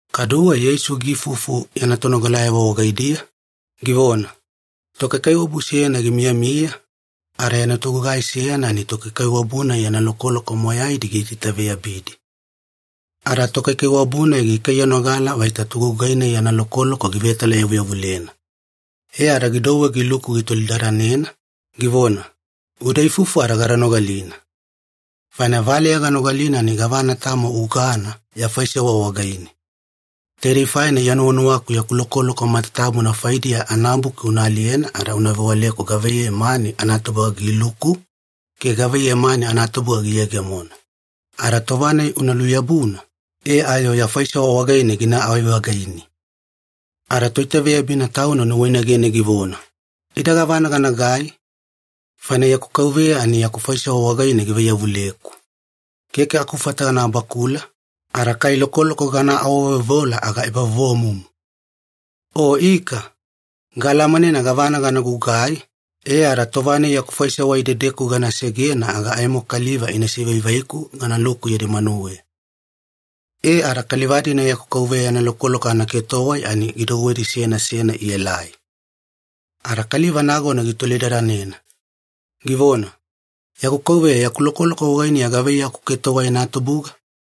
Kaduwe Yeisu giifufu yana tonogalayavo wagaidiya, givona, “Tokaikaiwabu seyana gimiyamiya, ada yana togugai seyana ani tokaikaiwabu-nai yana lokoloko moyaidi giitaitaveyabidi. Ada tokaikaiwabu-nai gikaiyanogala vaita togugai-nai yana lokoloko givetalayavuyavulena. E ada gidouwe giluku gitolidadanena, givona, ‘Uda ifufu gada nogalina. Faina valeya ganogalina ani gavana tamo ugana ya faisewa wagaine. Taidei faina Iya nuwanuwaku yaku lokoloko matatabuna faidiya anabuki una aliyena ada una vewaleku gavaiyei mani anatubuga giluku, ke gavaiyei mani anatubuga giyegemona. Ada tova-nai una luyabuna, e ayo ya faisewa wagaine ginaavai-vagaini.’ “Ada toitaveyabina tauna nuwainagene givona, ‘Ida gavana ganagai? Faina yaku kauveya ani yaku faisewa wagaine givaiyavuleku. Keke akufata gana bakula, ada kai lokoloko gana awaveoveola aga ebavovomumu. O ika! Gaalamanena gavana gana gugai, e ada tova-nai yaku faisewa idedeku gana segena aga aimo kaliva ina sivaivaiku ganaluku yadi manuweya.’ “E ada kaliva-dina yana kauveya yana lokoloko anatoketowai ani gidouwedi seyana seyana ielai. Ada kaliva nagona gitolidadanena, givona, ‘Yaku kauveya yana lokoloko wagaine gavaiyei aketowai anatubuga?’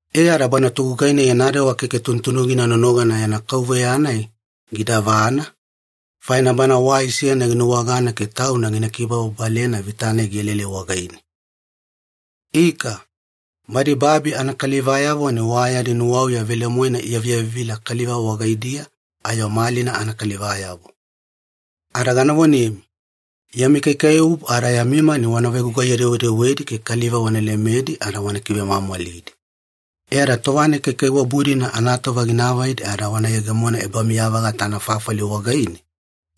“E ada bana togugai-nai yana dewa keke tunutunugina nonogana yana kauveya-nai gidavana, faina bana wai seyana ginuwagana ke tauna gina kibababalena vita-nai gielaelai wagaine. Ika, badi babi anakalivayavo ani wa yadi nuwauya velemoena iyavivila kaliva wagaidiya ayo malina anakalivayavo. Ada gana vonemi, yami kaikaiwabu ada yami mani wana vegugaiye-dewedewedi ke kaliva wana lemedi ada wana kivemwamwalidi, e ada tova-nai kaikaiwabu-dina anatova gina avaidi ada wana yegemona ebamiya-vagata anafafali wagaine,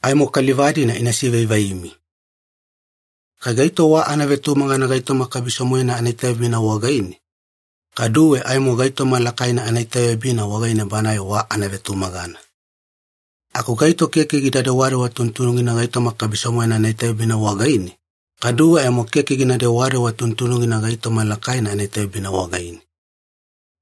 aimo kaliva-dina ina sivaivaimi. “Kai gaito wa anavetumagana gaitoma kabiso-moena anaitaveyabina wagaine, kaduwe aimo gaitoma lakaina anaitaveyabina wagaine banae wa anavetumagana. Aku gaito keke gida dewadewa tunutunugina gaitoma kabiso-moena anaitaveyabina wagaine, kaduwe aimo keke gina dewadewa tunutunugina gaitoma lakaina anaitaveyabina wagaine.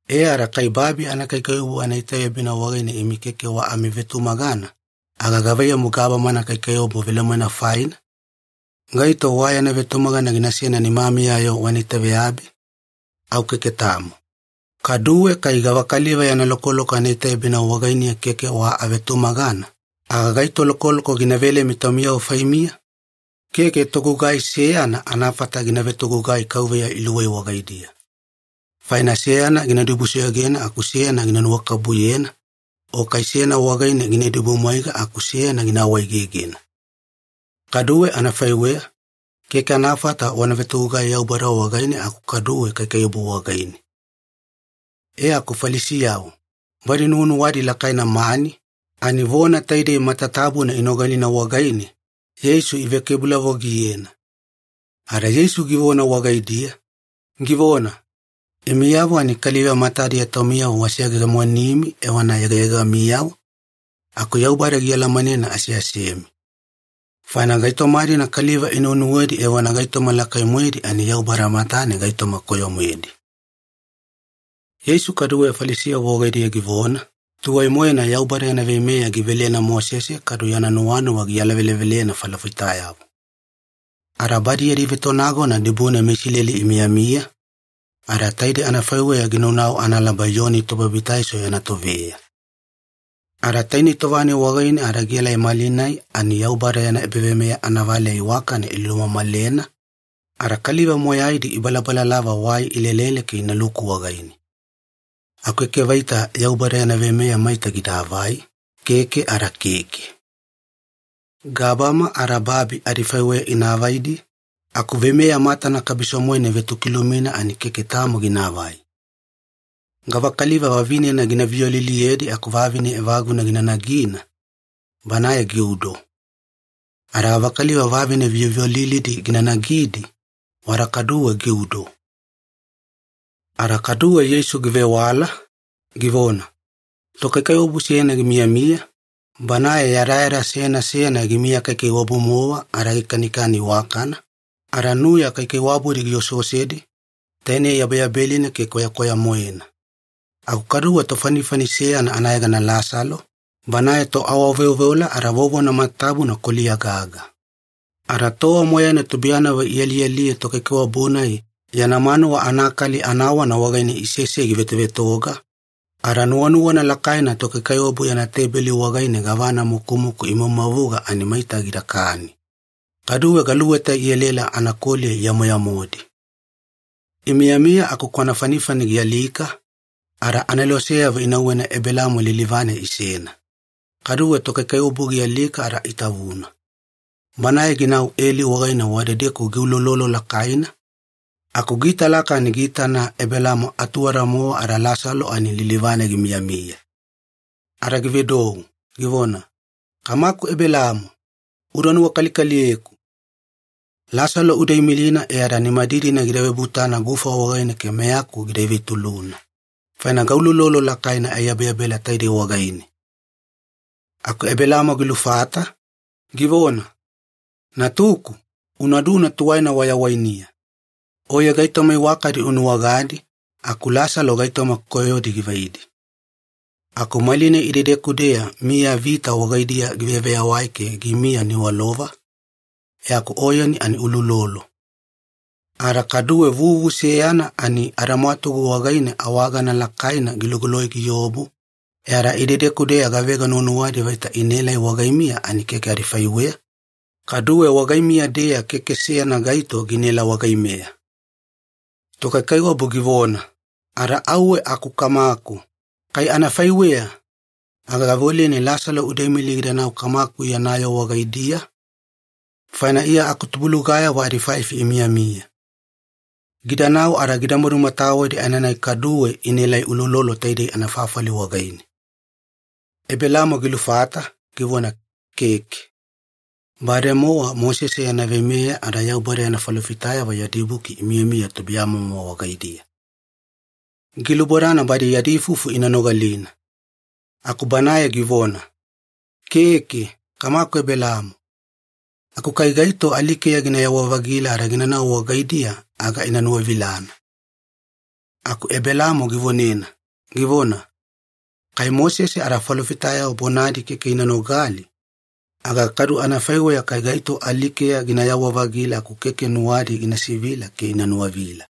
E ada kai babi anakaikaiwabu anaitaveyabina wagaine imi keke wa amivetumagana, aga gavaiyamu gabama anakaikaiwabu velemoena faine? Gaito wa yana vetumagana ginasena nimamiya-yo wana itaveyabi? Au keke tamo. Kaduwe kai gavakaliva yana lokoloko anaitaveyabina wagaine keke wa amivetumagana, aga gaito lokoloko gina velemi taumiyavo faimiya? Keke togugai seyana anafata gina vetogugai kauveya iluwei wagaidiya. Faina seyana gina dibusoyogena aku seyana gina nuwakabubuyena, o kai seyana wagaine gina idibumwaiga aku seyana gina awaegegena. Kaduwe anafaiweya, keke anafata wana vetogugai Yaubada wagaine aku kaduwe kaikaiwabu wagaine.” E aku Falisiyavo, badi nuwanuwadi lakaina mani, ani vona taidei matatabuna inogalina wagaine, Yeisu ivekebulavogiyena. Ada Yeisu givona wagaidiya, givona, “Imiyavo ani kaliva matadiya taumiyavo waseyegemonimi evona yegayegamiyavo, aku Yaubada gialamanena aseasemi. Faina gaitoma-dina kaliva inuwenuwedi evona gaitoma lakai-moedi ani Yaubada matane gaitoma koyo-moedi.” Yeisu kaduwe Falisiyavo wagaidiya givona, “Tuwai-moena Yaubada yana veimeya givelena Mosese kadu yana nuwanuwa gialavelevelena falofitayavo. Ada badi yadi vetonagona dibune meIsileli imiyamiya, ada taide anafaiweya ginaunau analaba Iyoni Tobabitaiso yana toveya. Ada tainei tova-nai wagaine ada gielai malinai ani Yaubada yana ebaveimeya anavaleya iwakana ilumamalena, ada kaliva moyaidi ibalabalalava wai ilelele ke inaluku wagaine. Aku keke vaita Yaubada yana veimeya maita gidaavai, keke ada keke. Gabama ada babi adifaiweya ina avaidi, aku veimeya matana kabiso-moena ivetokilumina ani keke tamo ginaavai. “Gavakaliva vavinena gina viyoliliyedi aku vavine evaguna gina nagina, banae giudo. Ada gavakaliva vavine viyoviyolilidi gina nagidi, wada kaduwe giudo.” Ada kaduwe Yeisu givewala, givona, “Tokaikaiwabu seyana gimiyamiya, banae yadayada seyana seyana gimiya kaikaiwabu-mowa ada gikanikani iwakana, ada nuya kaikaiwabudi gioseosedi, tainei yabeyabelina ke kwayakwaya-moena. Aku kaduwe tofanifani seyana anayegana Lasalo, banae toawaveoveola ada vovona matatabuna koliya gaga. Ada tova moyaina tubuiyanavo ialialiye tokaikaiwabu-nai yana manuwa anakali anawana wagaine isesei givetovetoga, ada nuwanuwana lakaina tokaikaiwabu yana teibeli wagaine gavana mukumuku imavumavuga ani maita gidakani. Kaduwe galuweta ielaela anakoliya iyamoyamodi. “Imiyamiya aku kwana fanifani gialika, ada aneloseyavo inauwena Ebelaamo lilivane isena. Kaduwe tokaikaiwabu gialika ada itavuna. Banae ginau eli wagaine wadedeku giuloulolo lakaina, aku giitalaka ani giitana Ebelaamo atuwada-mowa ada Lasalo ani lilivane gimiyamiya. Ada givedou, givona, ‘Kamaku Ebelaamo, uda nuwakalikaliyeku! Lasalo uda imilina e ada nimadidina gida vebutana gufa wagaine ke meyaku gida ivetuluna, faina gauloulolo lakaina aiyabeyabela taidei wagaine!’ “Aku Ebelaamo gilufata, givona, ‘Natuku, unaduna tuwaina wayawainiya. Oye gaitoma iwakadi unuwagadi, aku Lasalo gaitoma koyodi givaidi. Aku malinai idedeku-deya miyavita wagaidiya giveyaveyawai ke gimiya niwalova, e aku oyeni ani uuloulolo. Ada kaduwe vuvu seyana ani adamwatugu wagaine awagana lakaina gilugoloi giobu, e ada idedeku-deya gavega nuwanuwadi vaita inaelai wagaimiya ani keke adifaiweya, kaduwe wagaimiya-deya keke seyana gaito ginaela wagaimeya.’ “Tokaikaiwabu givona, ‘Ada auwe aku kamaku, kai anafaiweya, aga gaveoleni Lasalo uda imili gidanau kamaku yana yoo wagaidiya, faina Iya akutubulugayavo adifaifi imiyamiya. Gidanau ada gida madumatawedi aenanai kaduwe inaelai uloulolo taidei anafafali wagaine.’ “Ebelaamo gilufata, givona, ‘Keke. Bademowa Mosese yana veimeya ada Yaubada yana falofitayavo yadi buki imiyamiya tubuiyamomo wagaidiya. Gilubodana badi yadi ifufu ina nogalina.’ “Aku banae givona, ‘Keke, kamaku Ebelaamo. Aku kai gaito alikeya ginayawa-vagila ada ginanau wagaidiya aga ina nuwavilana.’ “Aku Ebelaamo givonena, givona, ‘Kai Mosese ada falofitayavo bonadi keke ina nogali, aga kadu anafaiweya kai gaito alikeya ginayawa-vagila aku keke nuwadi ina sivila ke ina nuwavila.’”